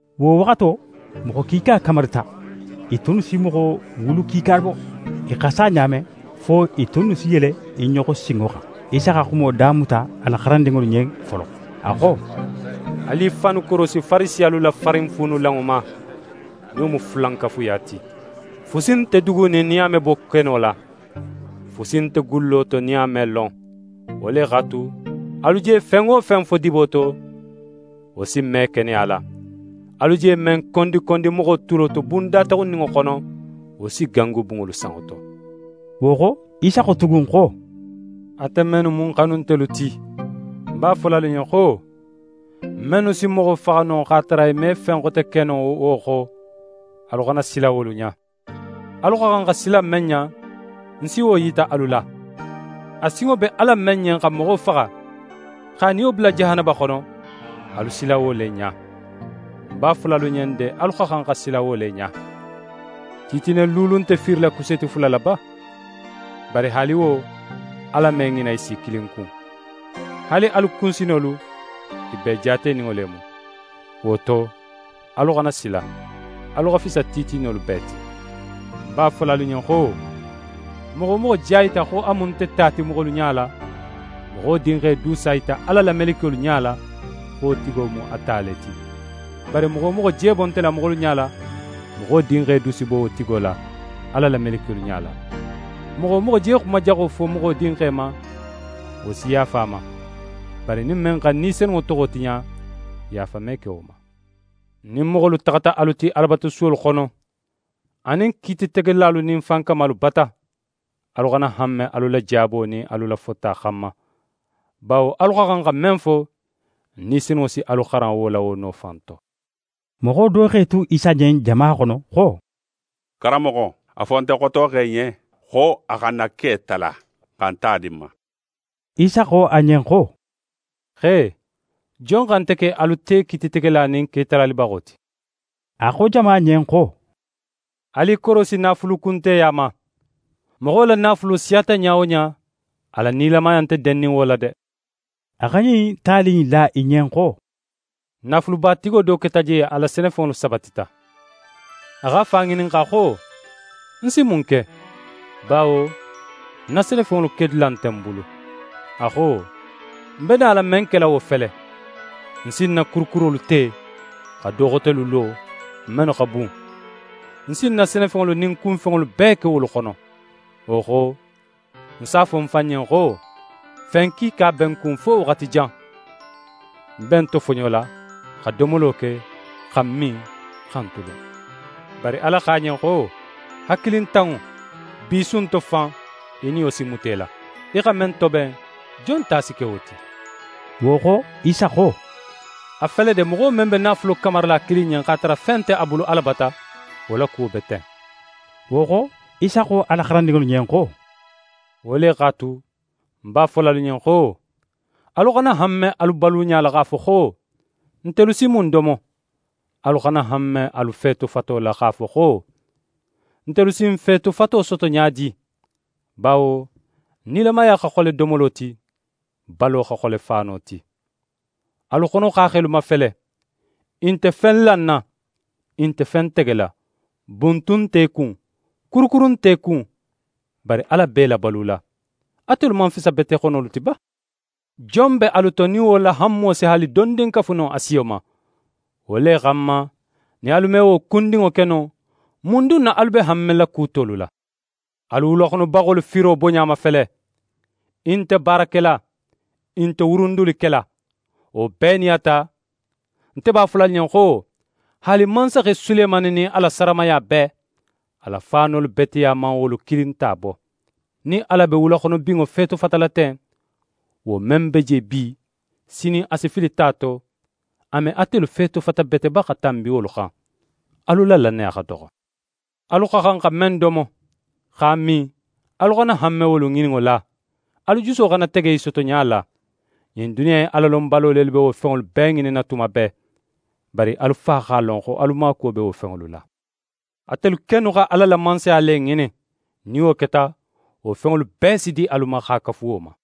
Wo waxato, moxo kiika kamarita, i tunnu si moxo wulu kiika bo. I xa sa ɲa men, fo i tunnu si yele i ɲoxo sinŋo xan. Isa xa xumo damuta a la xarandinŋolu ɲen folo, a xo: «Alu i fannu korosi Farisiyalu la farinfuunulanŋo ma, nin wo mu fulankafuya ti. Fusi nte dugunin nin a me bo keno la. Fusi nte gullo to nin a me lon. Wo le x'a tu, alu je fen wo fen fo dibo to, wo si me keneya la. Alu je men kondikondi moxo tulo to bun dataxunninŋo xono, wo si gangu bunŋolu sanŋo to.» Wo xo, Isa xo tugun xo: «Ate mennu mu ń xanuntelu ti, ń b'a fola alu ɲen xo: Mennu si moxo faxa no, x'a tara i me fen xote ke no wo xo, alu xana sila wolu ɲa. Alu xa xan xa sila men ɲa, ń si wo yita alu la: A sinŋo be Ala men ɲen xa moxo faxa, x'a niyo bula jahanaba xono, alu sila wo le ɲa. Ń b'a fola alu ɲen de, alu xa xan xa sila wo le ɲa! «Titine luulu nte fiirila kuseeti fula la ba? Bari haali wo, Ala me ŋina i si kilin kun. Haali alu kunsinolu, i bee jaateninŋo le mu. Wo to, alu xana sila. Alu xa fisa titinolu bee ti.» «Ń b'a fola alu ɲen xo: Moxo wo moxo je a yita xo a mu nte ta ti moxolu ɲala, Moxo Dinxe du s'a yita Ala la melekiyolu ɲala, xo wo tigo mu a ta le ti. Bari moxo wo moxo je bo nte la, moxolu ɲala, Moxo Dinxe du si bo wo tigo la, Ala la melekiyolu ɲala. Moxo wo moxo je xuma jaxo fo Moxo Dinxe ma, wo si yaafa a ma; bari nin men xa Ni Senunŋo toxo tiɲa, yaafa me ke wo ma. «Nin moxolu taxata alu ti Alabatusuwolu xono, anin kiititegelalu nin fankamalu bata, alu xana hanme alu la jaabo nin alu la fota xanma, bawo alu xa xan xa men fo, Ni Senunŋo si alu xaran wo la wo no fan to.» Moxo do x'é tu Isa ɲen jama xono xo: «Karanmoxo, a fo nte xotoxe ɲen xo a xa n na ke tala, xa ń ta di ń ma.» Isa xo a ɲen xo: «Xe, jon xa nte ke alu te kiititegela nin ketalalibaxo ti?» A xo jama ɲen xo: «Alu i korosi naafulukunteya ma. Moxo la naafulo siyata ɲa wo ɲa, a la nilamaya nte dennin wo la de.» A xa ɲin tali in la i ɲen xo: «Naafulubatigo do keta je, a la senefenŋolu sabatita. A x'a fan ŋininxa xo: “Ń si mun ke? Bawo ń na senefenŋolu kedula nte ń bulu.” A xo: “Ń be nala men kela wo fele: Ń si ń na kurukurolu te, xa do xotelu lo, mennu xa bun. Ń si ń na senefenŋolu nin ń kunfenŋolu bee ke wolu xono. Wo xo, ń s'a fo ń fan ɲen xo: Fen kiika be ń kun fo waxati jan. Ń be ń tofoɲola, xa domolo ke, xa ń min, xa ń tulun.” Bari Ala xo a ɲen xo: “Hakilintanŋo, bi su in to fan, í niyo si muta í la. Í xa men toben, jon ta si ke wo ti?”» Wo xo, Isa xo: «A fele de, moxo men be naafulo kamarila a kilin ɲen, x'a tara fen nte a bulu Ala bata, wo la kuwo be ten.» Wo xo, Isa xo a la xarandinŋolu ɲen xo: «Wo le x'a tu, ń b'a fola alu ɲen xo: Alu xana hanme alu baluɲa la x'a fo xo: “Ntelu si mun domo?” Alu xana hanme alu feetofato la x'a fo xo: “Ntelu si n feetofato soto ɲa di?” Bawo nilamaya xa xole domolo ti, balo xa xole faano ti. Alu xonoxaaxelu mafele, i nte fen lanna, i nte fen tegela. Buntun nt'e kun, kurukuru nt'e kun, bari, Ala be i labalula. Atelu man fisa bete xonolu ti ba? Jon be alu to, nin wo la hanmo si haali dondin kafu no a siyo ma? Wo le xanma, nin alu me wo kundinŋo ke no, mun dun na alu be hanmela ku tolu la? Alu wulaxonobaxolu firo boɲa mafele. I nte baara kela, i nte wurundili kela. Wo bee nin a ta, nte b'a fola alu ɲen xo, haali mansaxe Sulemani nin a la saramaya bee, a la faanolu beteya man wolu kilin ta bo. Nin Ala be wulaxonobinŋo feetofatala ten, wo men be je bi, sinin a si fili ta to, a me atelu feetofata bete ba xa tanbi wolu xan? Alu la lannaya xa doxo. Alu xa xan xa men domo, x'a min, alu xana hanme wolu ŋininno la, alu juso xana tege i sotoɲa la. Ɲin duniya in Alalonbalo lelu be wo fenŋolu bee ŋininna tuma bee. Bari alu Fa x'a lon xo alu maakuwo be wo fenŋolu la. Atelu kennu xa Ala la Mansaya le ŋinin. Nin wo keta, wo fenŋolu bee si di alu ma x'a kafu wo ma.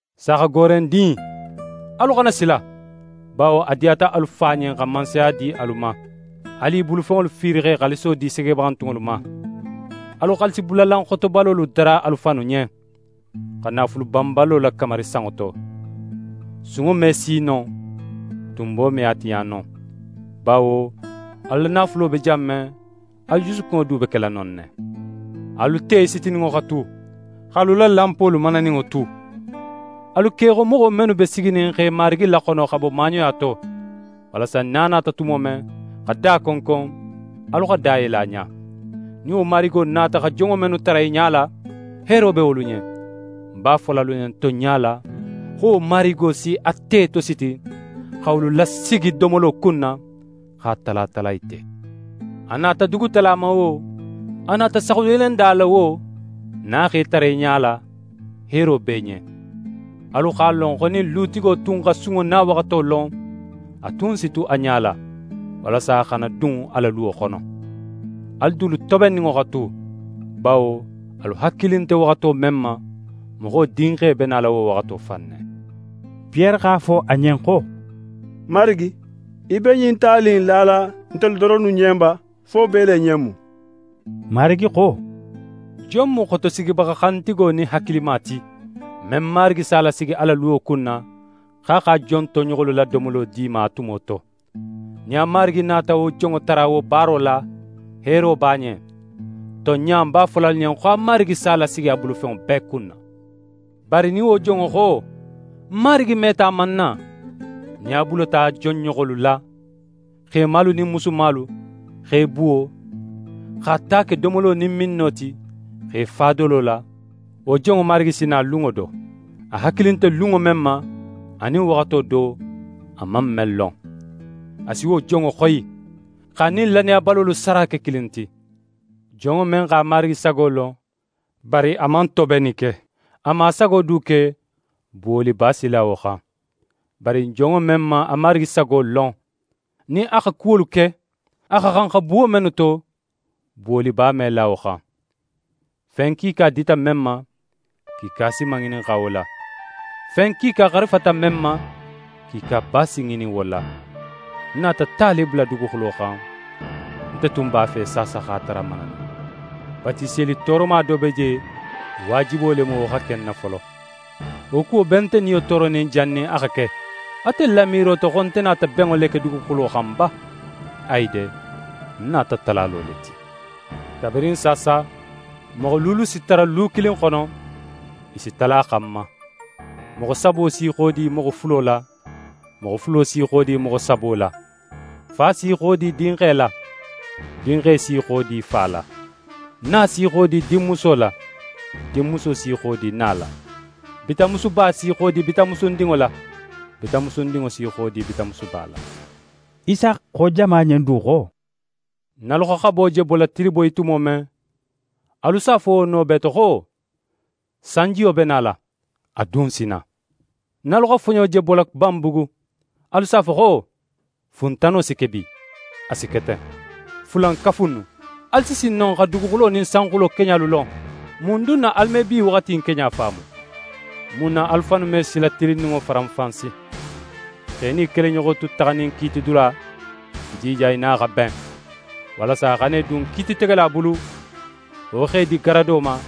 «Saaxagoorendin, alu xana sila! Bawo a diyata alu Fa ɲen xa Mansaya di alu ma. Alu i bulufenŋolu fiiri x'e xaaliso di segebaxantunŋolu ma. Alu xaalisibulalan xotobalolu dara alu fannu ɲen, xa naafulu banbalo lakamari sanŋo to: Sunŋo me si non, tunbo me a tiɲa non. Bawo alu la naafulo be jan men, alu jusukunŋo du be kela non ne. «Alu te sitininŋo xa tu, x'alu la lanpolu mananinŋo tu. Alu ke í xo moxo mennu be siginin x'e marigi laxono xa bo maaɲoya to, walasa nin a nata tumo men xa da konkon, alu xa da yele a ɲa. Nin wo marigo nata xa jonŋo mennu tara i ɲala, heero be wolu ɲen. Ń b'a fola alu ɲen, tonɲa la, xo wo marigo si a te tositi, xa wolu lasigi domolo kunna, x'a tala tala i te. A nata dugutala ma wo, a nata saxuyelenda la wo, nin a x'e tara i ɲala, heero be i ɲen. Alu x'a lon xo nin lutigo tun xa sunŋo nawaxato lon, a tun si tu a ɲala, walasa a xana dun a la luwo xono. Alu dulu tobenninŋo xa tu, bawo alu hakili nte waxato men ma, Moxo Dinxe be nala wo waxato fan ne.» Piyere x'a fo a ɲen xo: «Marigi, í be ɲin tali in lala ntelu doronnu ɲen ba, fo bee le ɲen mu?» Marigi xo: «Jon mu xotosigibaxa xantigo nin hakilima ti, men marigi s'a lasigi a la luwo kunna, xo a x'a jon toɲoxolu la domolo di i ma a tumo to? Nin a marigi nata wo jonŋo tara wo baaro la, heero b'a ɲen. Tonɲa, ń b'a fola alu ɲen xo a marigi s'a lasigi a bulufenŋo bee kunna. Bari nin wo jonŋo xo: “Ń marigi meta a man na;” nin a bulata jon ɲoxolu la, xemalu nin musumalu, x'e buwo, x'a ta ke domolo nin minno ti, x'é fa dolo la, wo jonŋo marigi si na lunŋo do, a hakili nte lunŋo men ma, anin waxato do, a man men lon. A si wo jonŋo xoyi, x'a nin lannayabalolu sara ke kilin ti. Jonŋo men x'a Marigi sago lon, bari a man tobenni ke, a man a sago du ke, buwoliba si la wo xan. Bari jonŋo men man a Marigi sago lon, nin a xa kuwolu ke, a xa xan xa buwo mennu to, buwoliba me la wo xan. Fen kiika dita men ma, kiika si maŋininxa wo la; fen kiika xarifata men ma, kiikaba si ŋinin wo la. «Ń nata ta le bula duguxulo xan. Nte tun b'a fe saasa x'a tara mananin. Batiseli tooroma do be je; waajibo le mu, wo xa ke ń na folo. Wo kuwo be nte niyo tooronin jannin a xa ke! Atelu la miiro to xo nte nata benŋo le ke duguxulo xan ba? Ayi de, ń nata talalo le ti. Kabirin saasa, moxo luulu si tara lu kilin xono, i si tala xan ma. Moxo sabo s'i xodi moxo fulo la, moxo fulo s'i xodi moxo sabo la. Fa s'í xodi dinxe la, dinxe s'í xodi fa la. Na s'í xodi dinmuso la, dinmuso s'í xodi na la. Bitanmusuba s'í xodi bitanmusundinŋo la, bitanmusundinŋo s'í xodi bitanmusuba la.» Isa xo jama ɲen du xo: «Nin alu xa xabo je bola tiliboyi tumo men, alu s'a fo wo no bee to xo: “Sanjiyo be nala,” a dun si na. Nin alu xa foɲo je bola banbugu, alu s'a fo xo: “Funtano si ke bi,” a si ke ten. Fulankafu innu! Alu si sin no xa duguxulo nin sanxulo keɲalu lon; mun dunna alu me bi waxati in keɲa faamu? «Mun na alu fannu me sila tilinninŋo faranfansi? X'é nin í keleɲoxo tu taxanin kiitidula, í jija í nin a xa ben, walasa a xana í dun kiititegela bulu, wo x'é di garado ma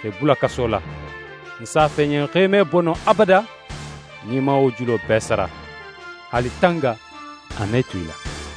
x'é bula kaso la. Ń s'a fo í ɲen xo í me bo non abada nin í man wo julo bee sara. Haali tanga, a me tu í la.»